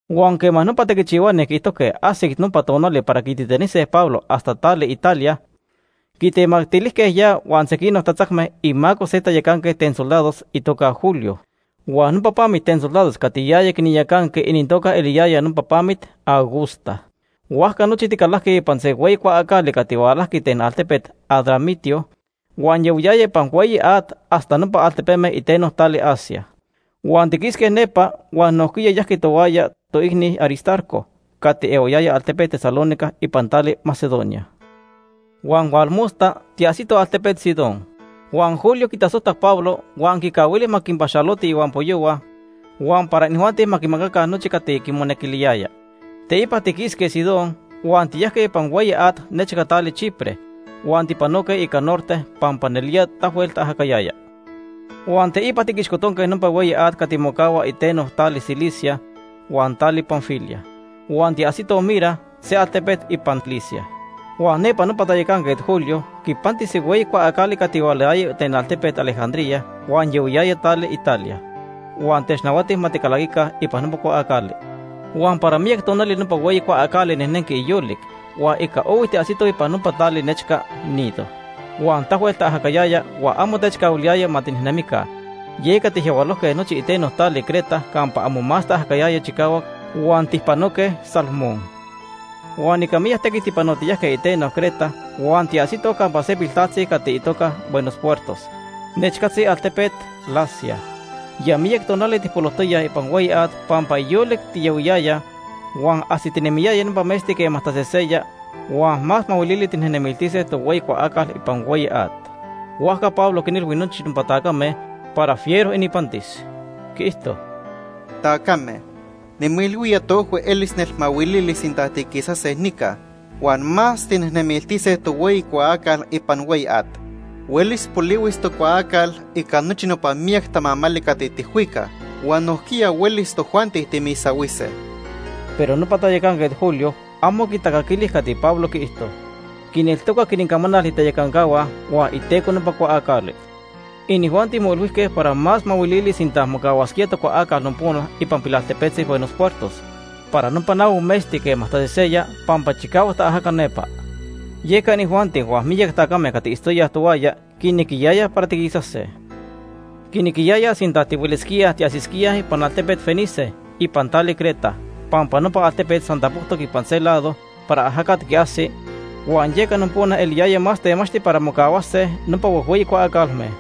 Huan quema nopa tequichihuani quiijtojque ajsic nopa tonali para quititanise Pablo hasta tali Italia, quitemactilijque ya huan sequinoc tatzacme imaco se tayacanquet ten soldados itoca Julio. Huan nopa pamit ten soldados cati yaya quinyacanqui inintoca eliyaya nopa Pamit Augusta. Huajca nochi ticalajque ipan se hueyi cuaacali cati hualajqui ten altepet Adramitio huan yahuiyaya ipan hueyi at hasta nopa altepeme iteno tali Asia. Huan tiquisque nepa huan nojquiya yajqui tohuaya toicni Aristarco cati ehuayaya altepet Tesalónica ipan tali Macedonia. Huan tonili tiajsitoj altepet Sidón. Huan Julio quitasojtac Pablo huan quicahuili ma quinpaxaloti ihuampoyohua huan para inijuanti ma quimacaca nochi cati quimonequiliyaya. Teipa tiquisque Sidón huan tiyajque ipan hueyi at nechca tali Chipre huan tipanoque ica norte pampa nelía tahuel taajacayaya. Huan teipa tiquixcotonque nopa hueyi at cati mocahua iteno tali Cilicia huan tali Panfilia. Huan tiajsitoj Mira, se altepet ipan Licia. Huan nepa nopa tayacanquet Julio quipanti se hueyi cuaacali cati hualayaya ten altepet Alejandría huan yahuiyaya tali Italia, huan technahuati ma ticalaquica ipan nopa cuaacali. Huan para miyac tonali nopa hueyi cuaacali nejnenqui yolic, huan ica ohui tiajsitoj ipan nopa tali nechca Gnido. Huan tahuel taajacayaya huan amo techcahuiliyaya ma tinejnemica, yeca tijyahualojque nochi iteno tali Creta campa amo más taajacayaya chicahuac huan tijpanoque Salmón. Huan ica miyac tequit tipanotiyajque iteno Creta huan tiajsitoj campa se pilaltepetzi cati itoca Buenos Puertos nechcatzi altepet Lasea. Ya miyac tonali tijpolojtoyaj ipan hueyi at pampa yolic tiyahuiyayaj huan ajsitinemiyaya nopa metzti quema taseseya huan más mahuilili tijnejnemiltise tohueyi cuaacal ipan hueyi at. Huajca Pablo quinilhui nochi nopa tacame para moilhuiyaya para fiero ininpantis. Quiijto: ―Tacame, nimoilhuía toojhui elis nelmahuilili sinta tiquisase nica huan más tijnejnemiltise tohueyi cuaacal ipan hueyi at. Huelis polihuis tocuaacal ica nochi no miyac tamamali cati tijhuicaj huan nojquiya huelis tojuanti timisahuise. Pero nopa tayacanquet Julio amo quitacaquili cati Pablo quiijto. Quineltocac inincamanal itayacancahua huan iteco nopa cuaacali. Inijuanti moilhuijque para más mahuilili sinta mocahuasquía tocuaacal nopona ipan pilaltepetzi Buenos Puertos para nopa nahui metzti quema taseseya pampa chicahuac taajaca nepa. Yeca inijuanti huan miyac tacame cati itztoyaj tohuaya quinequiyayaj para tiquisase. Quinequiyayaj sinta tihuelisquíaj tiajsisquíaj ipan altepet Fenice ipan tali Creta pampa nopa altepet san tapojtoc ipan se lado para ajacat quiajsis huan yeca nopona eliyaya más temachti para mocahuase nopa huejhueyi cuaacalme.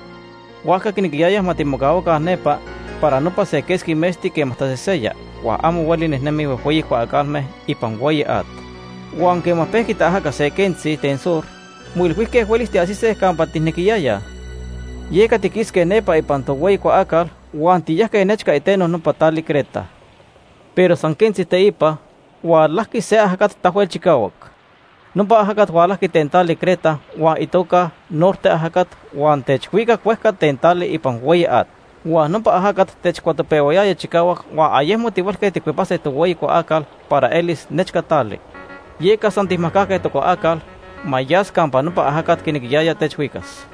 Huajca quinequiyayaj ma timocahuaca nepa para nopa se quesqui metzti quema taseseya huan amo hueli nejnemij huejhueyi cuaacalme ipan hueyi at. Huan quema pejqui taajaca se quentzi ten sur, moilhuijque huelis tiajsise campa tijnequiyayaj. Yeca tiquisque nepa ipan tohueyi cuaacal huan tiyajque nechca iteno nopa tali Creta. Pero san quentzi teipa, hualajqui se ajacat tahuel chicahuac. Nopa ajacat hualajqui ten tali Creta huan itoca Norte ajacat huan techhuicac huejca ten tali ipan hueyi at. Huan nopa ajacat techcuatopehuayaya chicahuac, huan ayecmo tihuelque tijcuepase tohueyi cuaacal para elis nechca tali. Yeca san tijmajcajque tocuaacal ma yas campa nopa ajacat quinequiyaya techhuicas.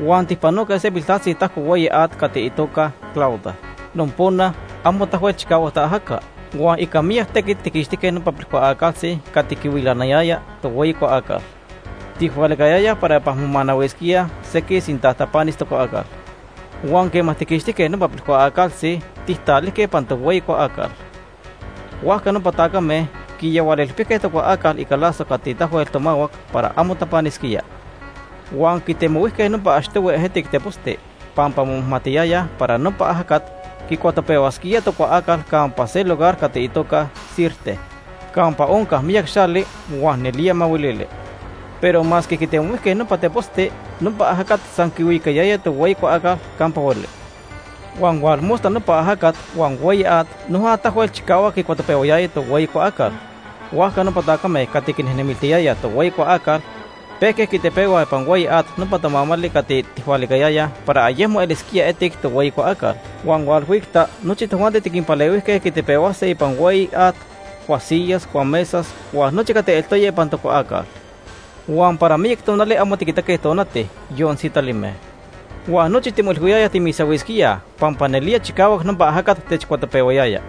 Huan tijpanoque se piltaltzi tatajco hueyi at cati itoca Clauda. Nepa quema amo tahuel chicahuac nopa ajacat, ica miyac tequit, tijtananque nopa pilcuaacaltzi cati quitilanayaya tohueyi cuaacal. Tijhualicayayaj para ipan momanahuisquíaj sequij sinta tapanis tocuaacal. Huan quema tijtananque nopa pilcuaacaltzi, tijtalijque ipan tohueyi cuaacal. Huajca nopa tacame quiyahualilpijque tocuaacal ica lazo cati tahuel tomahuac para amo tapanisquía. Huan quitemohuijque nopa achtohui ejetic teposti, pampa momajmatiyayaj para nopa ajacat quicuatopehuasquía tocuaacal campa se lugar cati itoca Sirte campa onca miyac xali, huan nelía mahuilili. Pero masque quitemohuijque nopa teposti, nopa ajacat san quihuicayaya tohueyi cuaacal campa hueli. Huan tonili nopa ajacat huan hueyi at noja tahuel chicahuac quicuatopehuayaya tohueyi cuaacal. Huajca nopa tacame cati quinejnemiltiyayaj tohueyi cuaacal pejque quitepehuaj ipan hueyi at nopa tamamali cati tijhualicayayaj para ayecmo elisquía etic tohueyi cuaacal. Huan hualhuicta nochi tojuanti tiquinpalehuijque quitepehuase ipan hueyi at cuasiyas, cuamesas, huan nochi cati eltoya ipan tocuaacal. Huan para miyac tonali amo tiquitaque tonati, yon sitalime. Huan nochi timoilhuiyayaj timisahuisquíaj pampa nelía chicahuac nopa ajacat techcuatopehuayaya.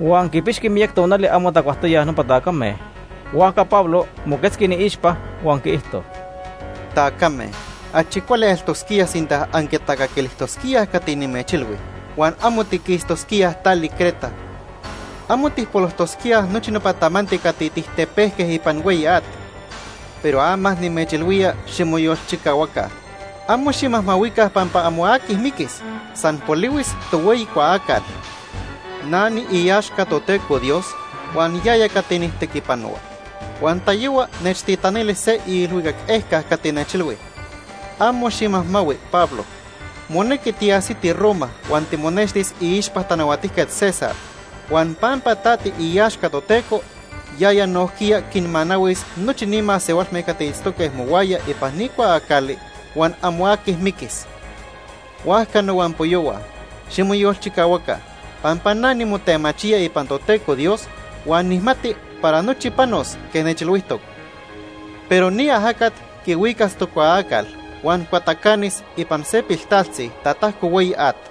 Huan quipixqui miyac tonali amo tacuajtoyaj nopa tacame, huajca Pablo moquetzqui iniixpa huan quiijto: ―Tacame, achi cuali eltosquía sinta anquitacaquilijtosquíaj cati nimechilhui huan amo tiquistosquíaj tali Creta. Amo tijpolojtosquíaj nochi nopa tamanti cati tijtepejque ipan hueyi at. Pero ama nimechilhuía ximoyolchicahuaca, amo ximajmahuica pampa amo aqui miquis, san polihuis tohueyi cuaacal. Na niiaxca Toteco Dios huan yaya cati nijtequipanohua. Huan tayohua nechtitanili se iilhuicac ejca cati nechilhui: ‘Amo ximajmahui, Pablo, monequi tiajsiti Roma huan timonextis iixpa Tanahuatijquet César, huan pampa ta tiiaxca Toteco, yaya nojquiya quinmanahuis nochi ni masehualme cati itztoque mohuaya ipan ni cuaacali huan amo aqui miquis.’ Huajca nohuampoyohua, ximoyolchicahuaca pampa na nimotemachía ipan Toteco Dios huan nijmati para nochi panos quej nechilhuijtoc. Pero ni ajacat quihuicas tocuaacal huan cuatacanis ipan se piltaltzi tatajco hueyi at.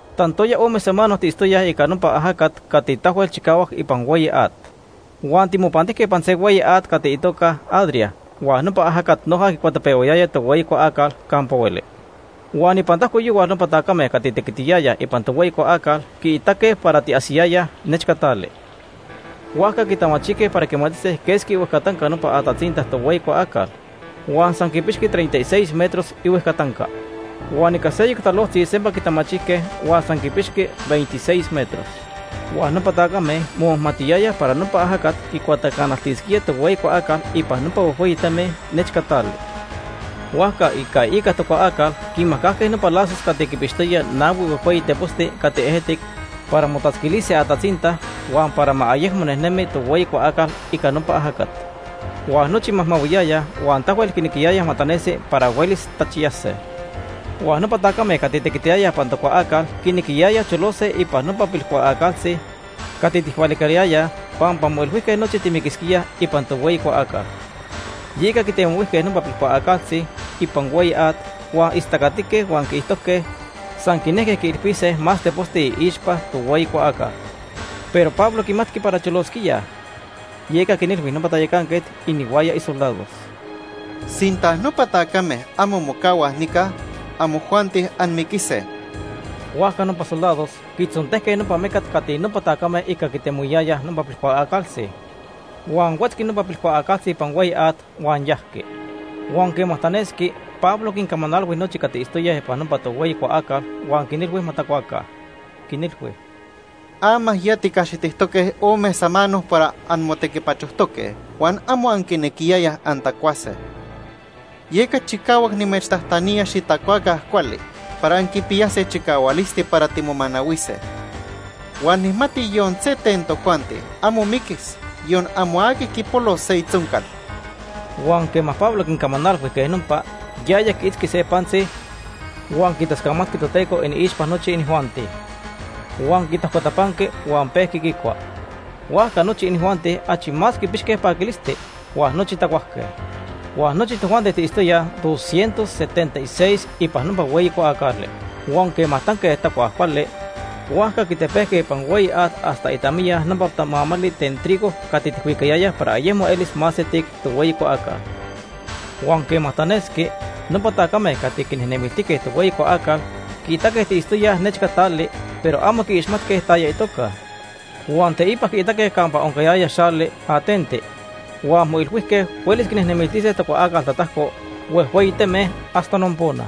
Tantoya ome samano tiitztoyaj ica nopa ajacat cati tahuel chicahuac ipan hueyi at. Huan timopantijque ipan se hueyi at cati itoca Adria huan nopa ajacat noja quicuatopehuayaya tohueyi cuaacal campa hueli. Huan ipan tajco yohual nopa tacame cati tequitiyayaj ipan tohueyi cuaacal quiitaque para tiajsiyayaj nechca tali. Huajca quitamachijque para quimatise quesqui ihuejcatanca nopa atatzinta tohueyi cuaacal, huan san quipixqui treinta y seis metros ihuejcatanca. Huan ica seyoc talojtzi sempa quitamachijque huan san quipixqui veintiseis metros. Huan nopa tacame momajmatiyayaj para nopa ajacat quicuatacanaltisquía tohueyi cuaacal ipan nopa huejhueyi teme nechca tali. Huajca ica iica tocuaacal quinmajcajque nopa lazos cati quinpixtoyaj nahui huejhueyi teposti cati ejetic para motatzquilise atatzinta huan para ma ayecmo nejnemi tohueyi cuaacal ica nopa ajacat. Huan nochi majmahuiyayaj huan tahuel quinequiyayaj ma tanesi para huelis tachiyase. Huan nopa tacame cati tequitiyayaj ipan tocuaacal quinequiyayaj cholose ipan nopa pilcuaacaltzitzi cati tijhualicayayaj pampa moilhuijque nochi timiquisquíaj ipan tohueyi cuaacal. Yeca quitemohuijque nopa pilcuaacaltzitzi ipan hueyi at, huan istacatique huan quiijtojque san quinejque quiilpise más teposti iixpa tohueyi cuaacal. Pero Pablo quimatqui para cholosquíaj, yeca quinilhui nopa tayacanquet inihuaya isoldados: ―Sinta nopa tacame amo mocahuaj nica, amojuanti anmiquise. Huajca nopa soldados quitzontejque nopa mecat cati nopa tacame ica quitemohuiyayaj nopa pilcuaacaltzi. Huan huetzqui nopa pilcuaacaltzi ipan hueyi at huan yajqui. Huan quema tanesqui, Pablo quincamanalhui nochi cati itztoyaj ipan tohueyi cuaacal huan quinilhui ma tacuaca. Quinilhui: ―Ama ya ticaxitijque ome samano para anmotequipachojtoque huan amo anquinequiyayaj antacuase. Yeca chicahuac nimechtajtanía xitacuaca cuali para anquipiyase chicahualisti para timomanahuise. Huan nijmati yon se ten tojuanti amo miquis, yon amo aqui quipolos se itzoncal. Huan quema Pablo quincamanalhui quej nopa, yaya quiitzqui se pantzi huan quitascamatqui Toteco iniixpa nochi inijuanti. Huan quitajcotapanqui huan pejqui quicua. Huajca nochi inijuanti achi más quipixque paquilisti, huan nochi tacuajque. Huan nochi tojuanti tiitztoyaj doscientos setenta y seis ipan nopa hueyi cuaacali. Huan quema tanque tacuaj cuali, huajca quitepejque ipan hueyi at hasta itamiya nopa tamamali ten trigo cati tijhuicayayaj para ayecmo elis más etic tohueyi cuaacal. Huan quema tanesqui, nopa tacame cati quinejnemiltijque tohueyi cuaacal quiitaque tiitztoyaj nechca tali, pero amo quiixmatque taya itoca. Huan teipa quiitaque campa oncayaya xali ateno, huan moilhuijque huelis quinejnemiltise tocuaacal tatajco huejhueyi teme hasta nopona.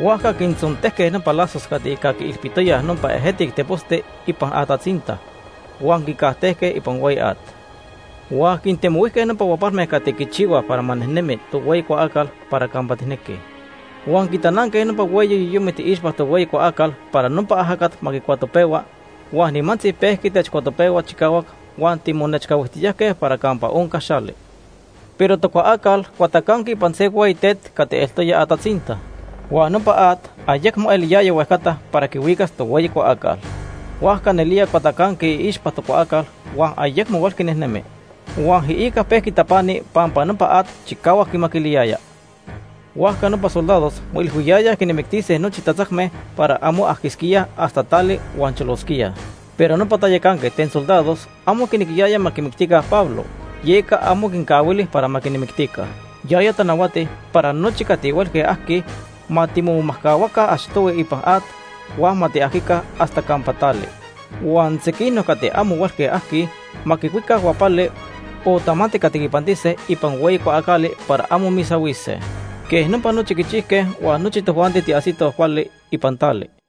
Huajca quintzontejque nopa lazos cati ica quiilpitoyaj nopa ejetic teposti ipan atatzinta, huan quincajtejque ipan hueyi at. Huan quintemohuijque nopa huapalme cati quichihuaj para ma nejnemis tohueyi cuaacal para campa tijnequij. Huan quitananque nopa hueyi yoyomit iixpa tohueyi cuaacal para nopa ajacat ma quicuatopehua, huan nimantzi pejqui techcuatopehua chicahuac huan timonechcahuijtiyajque para campa onca xali. Pero tocuaacal cuatacanqui ipan se hueyi tet cati eltoya atatzinta. Huan nopa at ayecmo eliyaya huejcata para quihuicas tohueyi cuaacal. Huajca nelía cuatacanqui iixpa tocuaacal huan ayecmo huelqui nejnemi. Huan iica pejqui tapani pampa nopa at chicahuac quimaquiliyaya. Huajca nopa soldados moilhuiyayaj quinmictise nochi tatzacme para amo ajquisquíaj hasta tali huan cholosquíaj. Pero nopa tayacanquet ten soldados amo quinequiyaya ma quimictica Pablo, yeca amo quincahuili para ma quinmictica. Yaya tanahuati para nochi cati huelque ajquij ma timomajcahuaca achtohui ipan at huan ma tiajquica hasta campa tali. Huan sequinoc cati amo huelque ajquij ma quicuica huapali o tamanti cati quipantise ipan hueyi cuaacali para amo misahuise. Quej nopa nochi quichijque huan nochi tojuanti tiajsitoj cuali ipan tali.